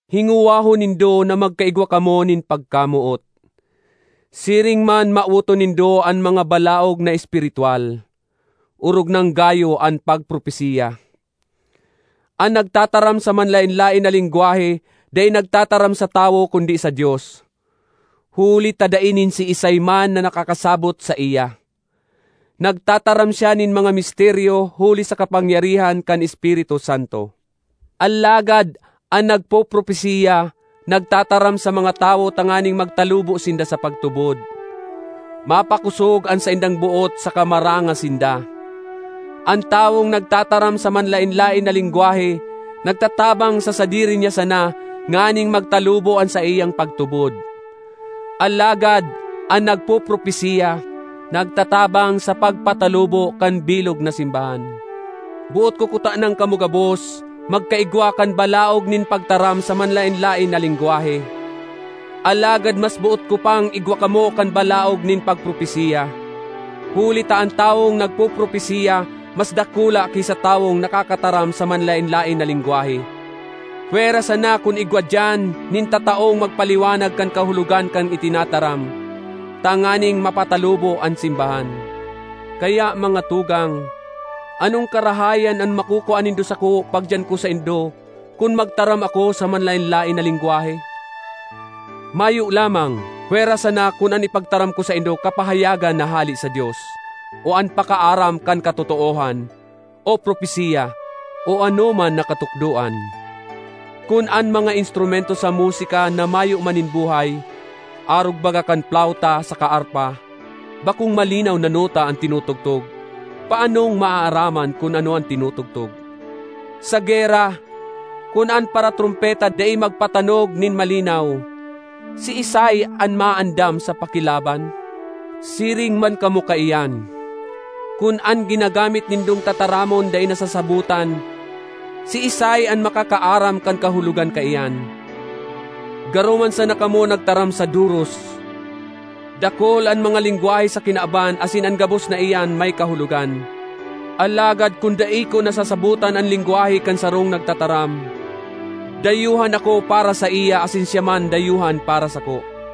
Hingowahon nindo na magkaigwa kamo nin pagkamoot; siring man mawoton nindo an mga balaog na espiritwal, orog nang gayo an pagpropesiya. An nagtataram sa manlaen-laen na lengwahe dai nagtataram sa tawo kundi sa Dios, huli ta dai nin siisay man na nakakasabot saiya. Nagtataram siya nin mga misteryo huli sa kapangyarihan kan Espiritu Santo. Alagad an nagpopropesiya nagtataram sa mga tawo tanganing magtalubo sinda sa pagtubod, mapakosog an saindang boot saka maranga sinda. An tawong nagtataram sa manlaen-laen na lengwahe nagtatabang sa sadiri niya sana nganing magtalubo an saiyang pagtubod; alagad an nagpopropesiya nagtatabang sa pagpatalubo kan bilog na simbahan. Boot ko kutanang kamo gabos magkaigwa kan balaog nin pagtaram sa manlaen-laen na lengwahe; alagad mas boot ko pang igwa kamo kan balaog nin pagpropesiya. Huli ta an tawong nagpopropesiya mas dakula ki sa tawong nakakataram sa manlaen-laen na lengwahe—pwera sana kun igwa diyan nin tataong magpaliwanag kan kahulogan kan itinataram, tanganing mapatalubo an simbahan. Kaya, mga tugang, anong karahayan an makukua nindo sako pagdiyan ko saindo kun magtaram ako sa manlaen-laen na lengwahe? Mayo lamang pwera sana kun an ipagtaram ko saindo kapahayagan na hale sa Dios, o an pakaaram kan katotoohan, o propesiya, o anoman na katukdoan. Kun an mga instrumento sa musika na mayo man nin buhay, arog baga kan plawta saka arpa, bakong malinaw na nota an tinutugtog, paanong maaaraman kun ano an tinutugtog? Sa gera, kun an paratrompeta dai magpatanog nin malinaw, siisay an maandam sa pakilaban? Siring man kamo kaiyan; kun an ginagamit nindong tataramon dai nasasabotan, siisay an makakaaram kan kahulogan kaiyan? Garo man sana kamo nagtaram sa doros! Dakul an mga lengwahe sa kinaban asin an gabos na iyan may kahulogan. Alagad kun dai ko nasasabotan an lengwahe kan sarong nagtataram, dayuhan ako para saiya asin siya man dayuhan para sako.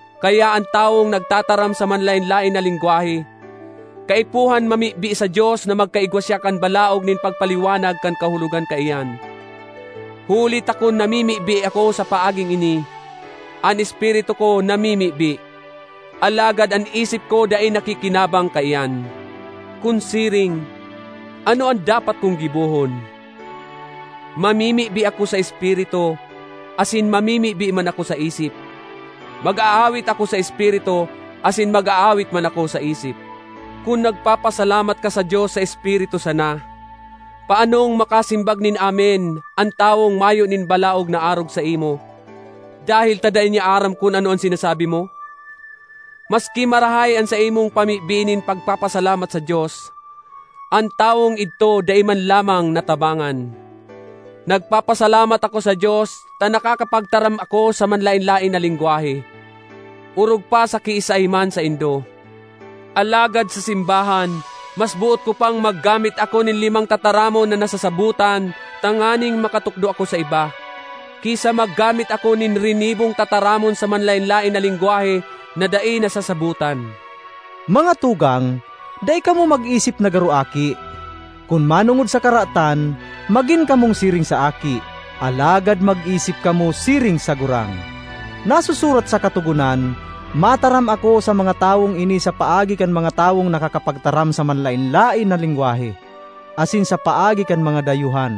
Kaya an tawong nagtataram sa manlaen-laen na lengwahe, kaipuhan mamibi sa Dios na magkaigwa siya kan balaog nin pagpaliwanag kan kahulogan kaiyan. Huli ta kun namimibi ako sa paaging ini, an espiritu ko namimibi, alagad an isip ko dai nakikinabang kaiyan. Kun siring, ano an dapat kong gibohon? Mamimibi ako sa espiritu, asin mamimibi man ako sa isip; mag-aawit ako sa espiritu, asin mag-aawit man ako sa isip. Kun nagpapasalamat ka sa Dios sa espiritu sana, paanong makasimbag nin “Amen” an tawong mayo nin balaog na arog saimo, dahel ta dai niya aram kun ano an sinasabi mo? Maski marahay an saimong pamibi nin pagpasalamat sa Dios, an tawong idto dai man lamang natabangan. Nagpapasalamat ako sa Dios ta nakakapagtaram ako sa manlaen-laen na lengwahe, orog pa sa kiisay man saindo. Alagad sa simbahan, mas boot ko pang maggamit ako nin limang tataramon na nasasabotan tanganing makatukdo ako sa iba, ki sa maggamit ako nin rinibong tataramon sa manlaen-laen na lengwahe na dai nasasabotan. Mga tugang, dai kamo mag-isip na garo aki. Kun manongod sa karatan, magin kamong siring sa aki, alagad mag-isip kamo siring sa gurang. Nasusurat sa Katogonan, “Mataram ako sa mga tawong ini sa paagi kan mga tawong nakakapagtaram sa manlaen-laen na lengwahe, asin sa paagi kan mga dayuhan,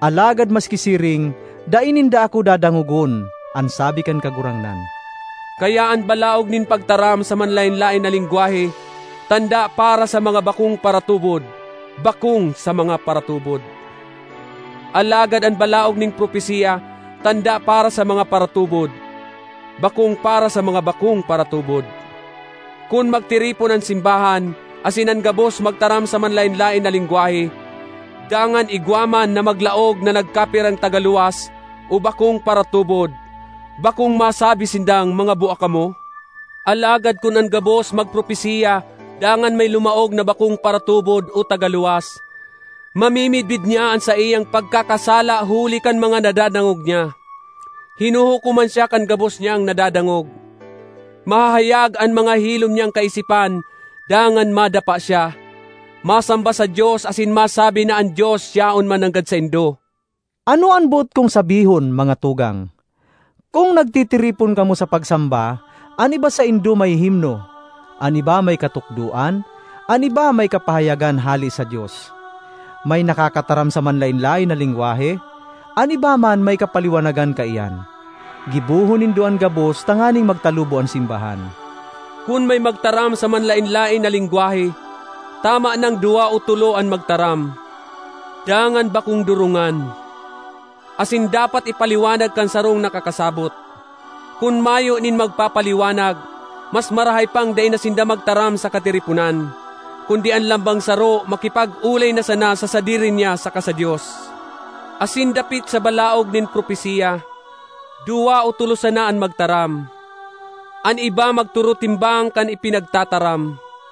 alagad maski siring, dai ninda ako dadangogon, an sabi kan Kagurangnan.” Kaya an balaog nin pagtaram sa manlaen-laen na lengwahe tanda para sa mga bakong paratubod, bakong sa mga paratubod. Alagad an balaog nin propesiya tanda para sa mga paratubod, bakong para sa mga bakong paratubod. Kun magtiripon an simbahan, asin an gabos magtaram sa manlaen-laen na lengwahe, dangan igwa man na maglaog na nagkapirang tagaluwas o bakong paratubod, bakong masabi sindang mga bua kamo? Alagad kun an gabos magpropesiya dangan may lumaog na bakong paratubod o tagaluwas, mamimidbid niya an saiyang pagkakasala huli kan mga nadadangog niya; hinuhukoman siya kan gabos niyang nadadangog. Mahahayag an mga hilom niyang kaisipan dangan madapa siya, masamba sa Dios asin masabi na an Dios yaon mananggad saindo! Ano an boot kong sabihon, mga tugang? Kun nagtitiripon kamo sa pagsamba, an iba saindo may himno, an iba may katukdoan, an iba may kapahayagan hale sa Dios, may nakakataram sa manlaen-laen na lengwahe; an iba man may kapaliwanagan kaiyan. Gibohon nindo an gabos tanganing magtalubo an simbahan. Kun may magtaram sa manlaen-laen na lengwahe, tama nang duwa o tolo an magtaram, dangan bakong durungan; asin dapat ipaliwanag kan sarong nakakasabot. Kun mayo nin magpapaliwanag, mas marahay pang dai na sinda magtaram sa katiriponan, kundi an lambang saro makipag-olay na sana sa sadiri niya saka sa Dios. Asin dapit sa balaog nin propesiya, duwa o tolo sana an magtaram; an iba magturutimbang kan ipinagtataram.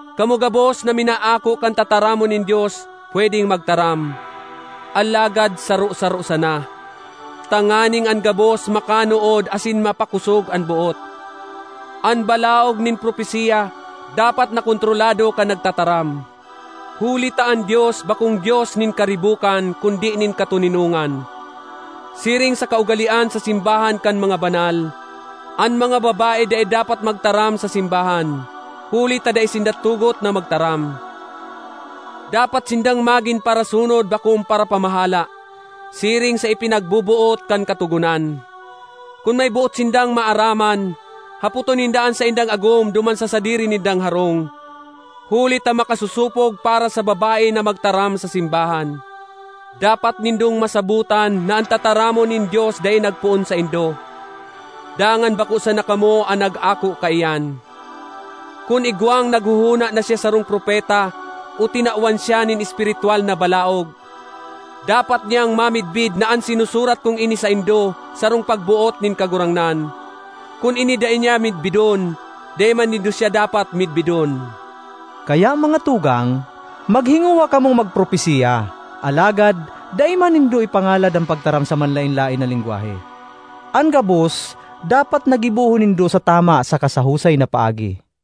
Kamo gabos na minaako kan tataramon nin Dios pwedeng magtaram, alagad saro-saro sana, tanganing an gabos makanood asin mapakosog an boot. An balaog nin propesiya dapat na kontrolado kan nagtataram. Huli ta an Dios bakong Dios nin karibokan kundi nin katoninongan. Siring sa kaugalean sa simbahan kan mga banal, an mga babae dai dapat magtaram sa simbahan, huli ta dai sinda tugot na magtaram. Dapat sindang magin parasunod bakong parapamahala, siring sa ipinagboboot kan Katogonan. Kun may boot sindang maaraman, hapoton ninda an saindang agom duman sa sadiri nindang harong. Huli ta makasosopog para sa babae na magtaram sa simbahan. Dapat nindong masabotan na an tataramon nin Dios dai nagpoon saindo, dangan bako sana kamo an nag-ako kaiyan. Kun igwang naghohona na siya sarong propeta o tinawan siya nin espiritwal na balaog, dapat niyang mamidbid na an sinusurat kong ini saindo sarong pagboot nin Kagurangnan. Kun ini dai niya midbidon, dai man nindo siya dapat midbidon. Kaya, mga tugang, maghingowa kamong magpropesiya alagad dai man nindo ipangalad an pagtaram sa manlaen-laen na lengwahe. An gabos dapat na gibohon nindo sa tama saka sa husay na paagi.